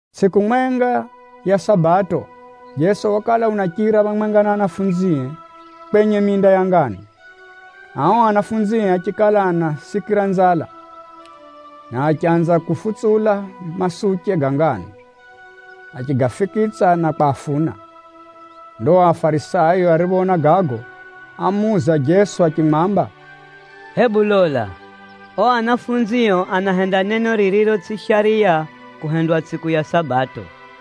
Tsʼiku mwenga ya Sabato, Jeso wakala unachira phamwenga na anafunzie kwenye minda ya nganu. Ao anafunzie achikala anasikira nzala, na achanza kufutsula masuche ga nganu, achigafikitsa na kwafuna. Ndo Afarisayo ariphoona gago, ámuuza Jeso achimwamba, “Hebu lola, ao anafunzio anahenda neno ririro tsʼi shariya kuhendwa tsʼiku ya Sabato!”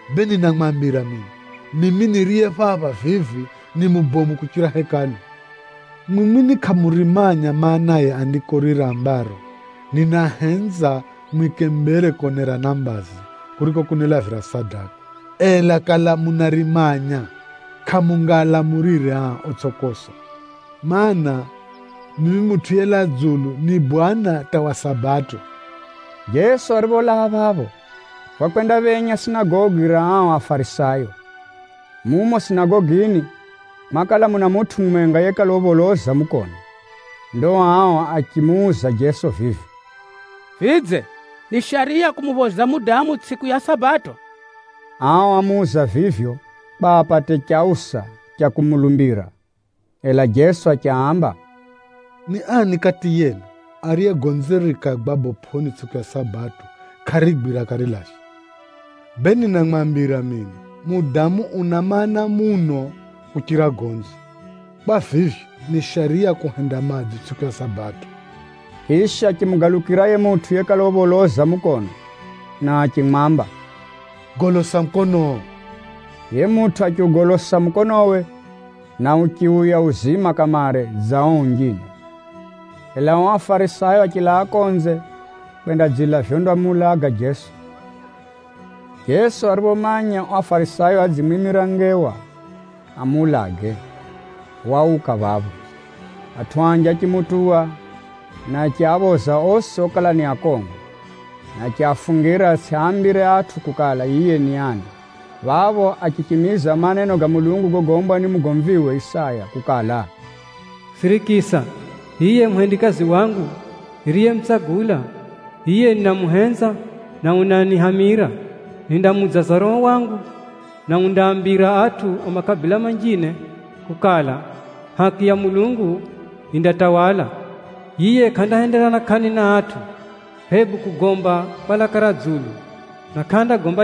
Bee ninamwambira mino, mimi niriye phapha vivi, ni mubomu kuchira Hekalu. Mwimwi ni kʼamurimanya maanaye Andiko riri rambaro, ‘Ninahenza mwike mbere konerana mbazi, kuriko kunilavira sadaka.’ Ela kala munarimanya, kʼamungaalamulire aa, otsʼi kosa. Maana, mimi Mutʼu yelaa dzulu, ni Bwana hata wa Sabato.” Jeso aripholaa phapho, wakwendaphenya sinagogi ra ao Afarisayo. Mumo sinagogini mwakala muna mutʼu mumwenga yekala upholoza mukono. Ndo ao achimuuza Jeso vivi, “Vidze, ni shariya kumuphoza mudamu tsʼiku ya Sabato?” Ao ámuuza vivyo, kwa apate chausa cha kumulumbira. Ela Jeso achiaamba, “Ni ani kati yenu, ariye gonzire rikagwa bopʼoni tsʼiku ya Sabato, kʼarigwira akarilavya? Bee ninamwambira mino, mudamu una maana muno kuchira gonzi! Kwa vivyo, ni shariya kuhenda madzo tsʼiku ya Sabato.” Chisha, achimugalukira yiye mutʼu yekala upholoza mukono, na achimwamba, “Golosa mukonoo!” Yiye mutʼu achiugolosa mukonowe, na uchiuya uzima kamare dza ao unjine. Ela ao Afarisayo achilaa konze kwendadzila vyondamuulaga Jeso. Jeso ariphomanya ao Afarisayo adzimwimira ngewa amuulage, wauka phapho. Atʼu anji achimutuwa, na achiaphoza osi okala ni akongo, na achiafungira atsʼiaambire atʼu kukala, yiye ni ani. Phapho achichimiza maneno ga Mulungu gogombwa ni mugomviwe Isaya kukala, “Sirikisa, hiye muhendikazi wangu niriyemutsagula, yiye ninamuhenza na unanihamira. Nindamuudzaza Roho wangu, na undaambira atʼu a makabila manjine kukala, haki ya Mulungu yindatawala. Yiye kʼandahenderana kʼani na atʼu hebu kugomba kwa laka ra dzulu, njira bomu.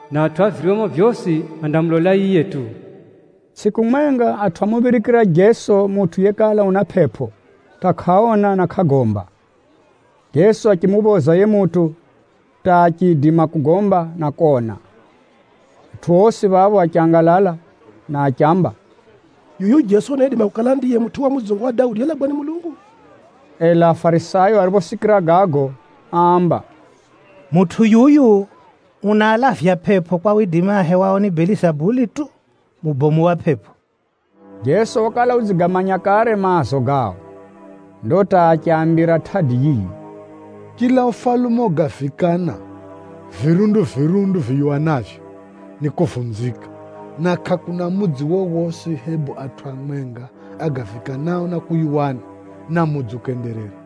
Na atʼu a viryomo vyosi andamulola yiye tu.” Tsʼiku mwenga, atʼu ámuphirikira Jeso mutʼu yekala una pʼepʼo hata kʼaona na kʼagomba. Jeso achimuphoza yiye mutʼu hata achiidima kugomba, na kona. Atʼu osi phapho achangalala, na achiamba, “Yuyu Jeso unaidima kukala ndiye mutʼu wa mudzungu wa Daudi yelagwa ni Mulungu!” Ela Afarisayo ariphosikira gago, áamba, “Mutʼu yuyu unaalavya pʼepʼo kwa widimi ahewao ni Belizabuli tu, mubomu wa pʼepʼo.” Jeso wakala udzigamanya kare maazo gao, ndo hata achiaambira tʼadi yiyi, “Chila ufalume ogavikana virundu-virundu viyuwanavyo, nikuvunzika: na kʼakuna mudzi wowosi, hebu atʼu amwenga agavikanao na kuyuwana, na mudzi ukenderera.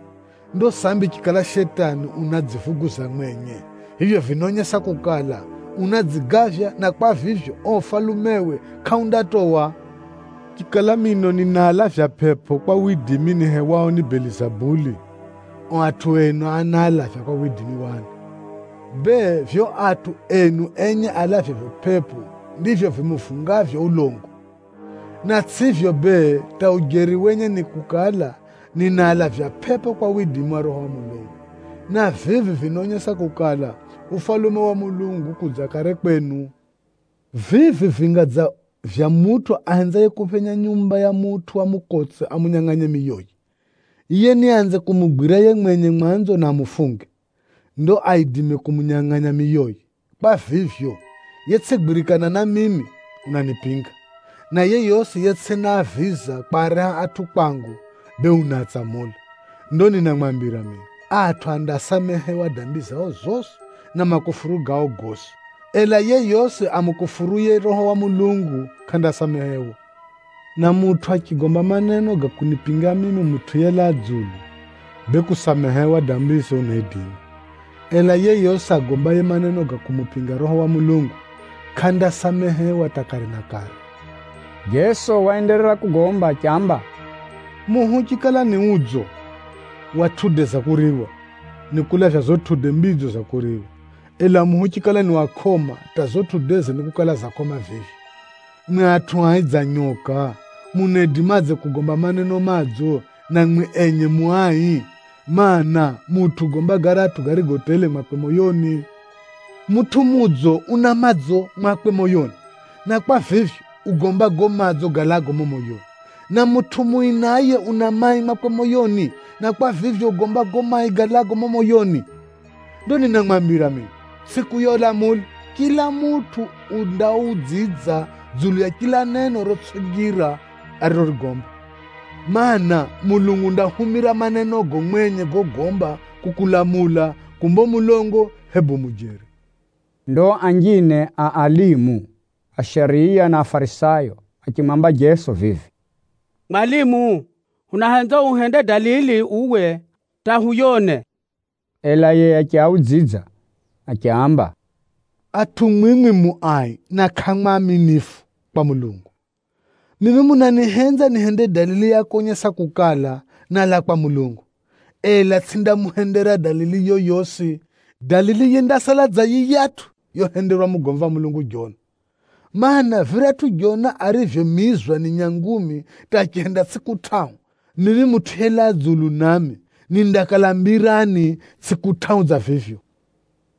Ndo sambi chikala Shetani unadzivuguza mwenye, vivyo vinaonyesa kukala, unadzigavya na kwa vivyo, uo ufalumewe kʼaundatowa. Chikala mino ninaalavya pʼepʼo kwa widimi nihewao ni Belizabuli, ao atʼu enu anaalavya kwa widimi wa ani? Bee, vivyo atʼu enu enye alavyavyo pʼepʼo, ndivyo vimuvungavyo ulongo. Na tsʼivyo bee, hata ujeri wenye ni kukala, ninaalavya pʼepʼo kwa widimi wa Roho wa Mulungu, na vivi vinaonyesa kukala, Ufalume wa Mulungu ukudza kare kwenu. “Vivi vinga dza vya mutʼu ahenzaye kuphenya nyumba ya mutʼu wa mukotse amunyangʼanye miyoye. Yiye niaanze kumugwira yiye mwenye mwanzo na amufunge, ndo aidime kumunyangʼanya miyoye. Kwa vivyo, yetsʼigwirikana na mimi, unanipinga, na yeyosi yetsʼinaaviza kwareha atʼu kwangu, bee unaatsamula. Ndo ninamwambira mino, atʼu andasamehewa dambi zao zosi na makufuru gao gosi, ela yeyosi amukufuruye Roho wa Mulungu, kʼandasamehewa. Na mutʼu achigomba maneno ga kunipinga mimi Mutʼu yelaa dzulu, bee kusamehewa dambize unaidima. Ela yeyosi agombaye maneno ga kumupinga Roho wa Mulungu, kʼandasamehewa hata kare na kare.” Jeso waenderera kugomba achiamba, “Muhi uchikala ni udzo wa matunda ga kuriwa, nikulavya gago matunda madzo ga kuriwa, ela muhi uchikala ni wa kʼoma, hata gago matundage nikukala ga kʼoma vivyo. Mwimwi atʼu ai dza nyoka! Munaidimadze kugomba maneno madzo, na mwimwi enye mu ai? Maana, mutʼu ugomba garatʼu garigo tele mwakwe moyoni. Mutʼu mudzo una madzo mwakwe moyoni, na kwa vivyo, ugomba gago madzo galaago mumo moyoni. Na mutʼu mui naye una mai mwakwe moyoni, na kwa vivyo, ugomba gago mai galaago mumo moyoni. Ndo ninamwambira mino, tsʼiku ya ulamuli, chila mutʼu undaudzidza dzulu ya chila neno rotsʼi njira arirogomba. Maana, Mulungu undahumira manenogo mwenye gogomba kukulamula kumba u mulongo, hebu u mujeri.” Ndo anjine a alimu a shariya na Afarisayo achimwamba Jeso vivi, “Mwalimu, hunahenza uhende dalili uwe hata huyone.” Ela yiye achiaudzidza achiaamba, “Atʼu mwimwi mu ai na kʼamu aaminifu kwa Mulungu! Mwimwi munanihenza nihende dalili ya konyesa kukala, nálaa kwa Mulungu, ela tsʼindamuhendera dalili yoyosi. Dalili yindasala dza yiyatʼu yohenderwa mugomvi wa Mulungu Jona. Maana, viratʼu Jona arivyomizwa ni nyangumi hata achihenda tsʼiku tʼahu, mimi Mutʼu yelaa dzulu nami, nindakala mbirani tsʼiku tʼahu dza vivyo.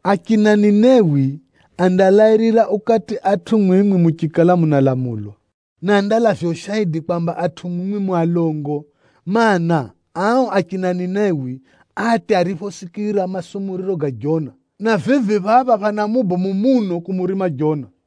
Achina Ninewi andalairira ukati atʼu mwimwi muchikala munalamulwa, na andalavya ushaidi kwamba atʼu mwimwi mu alongo! Maana, ao achina Ninewi átya ariphosikira masumuriro ga Jona, na vivi phapha phana mubomu muno kumurima Jona!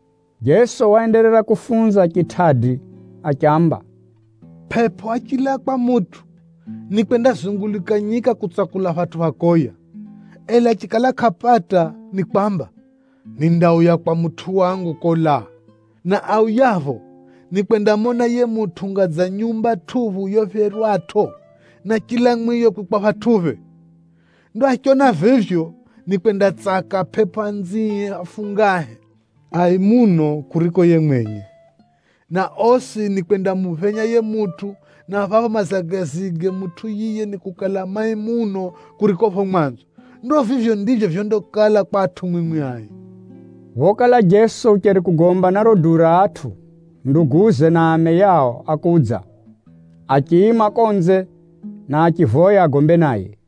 Jeso waenderera kufunza chitʼadi achiamba, “Pʼepʼo achilaa kwa mutʼu, nikwendazunguluka nyika kutsakula phatʼu pha koya. Ela achikala kʼapata, nikwamba, ‘Nindauya kwa mutʼu wangu kolaa.’ Na auyapho, nikwendamona yiye mutʼu unga dza nyumba tʼuphu yophyerwatʼo, na chila mwiyo kwikwa phatʼuphe. Ndo achiona vivyo, nikwendatsaka pʼepʼo anzie afungahe, ai muno kuriko yiye mwenye, na osi nikwendamuphenya yiye mutʼu. Na phapho mazagazige mutʼu yiye nikukala mai muno kuriko phapho mwanzo. Ndo vivyo ndivyo vyondakala kwa atʼu mwimwi ai!” Phokala Jeso ucheri kugomba na riro duu ra atʼu, ameye na nduguze a chilume, ákudza, achiima konze, na achivoya agombe naye.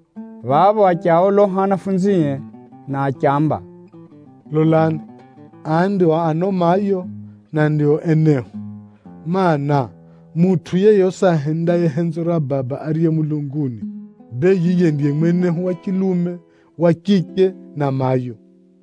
Phapho achiaoloha anafunzie, na achiamba, “Lolani! Aa ndio ano mayo, na ndio enehu a chilume! Maana, mutʼu yeyosi ahendaye henzo ra Baba ariye mulunguni, bee yiye ndiye mwenehu wa chilume, wa chiche na mayo.”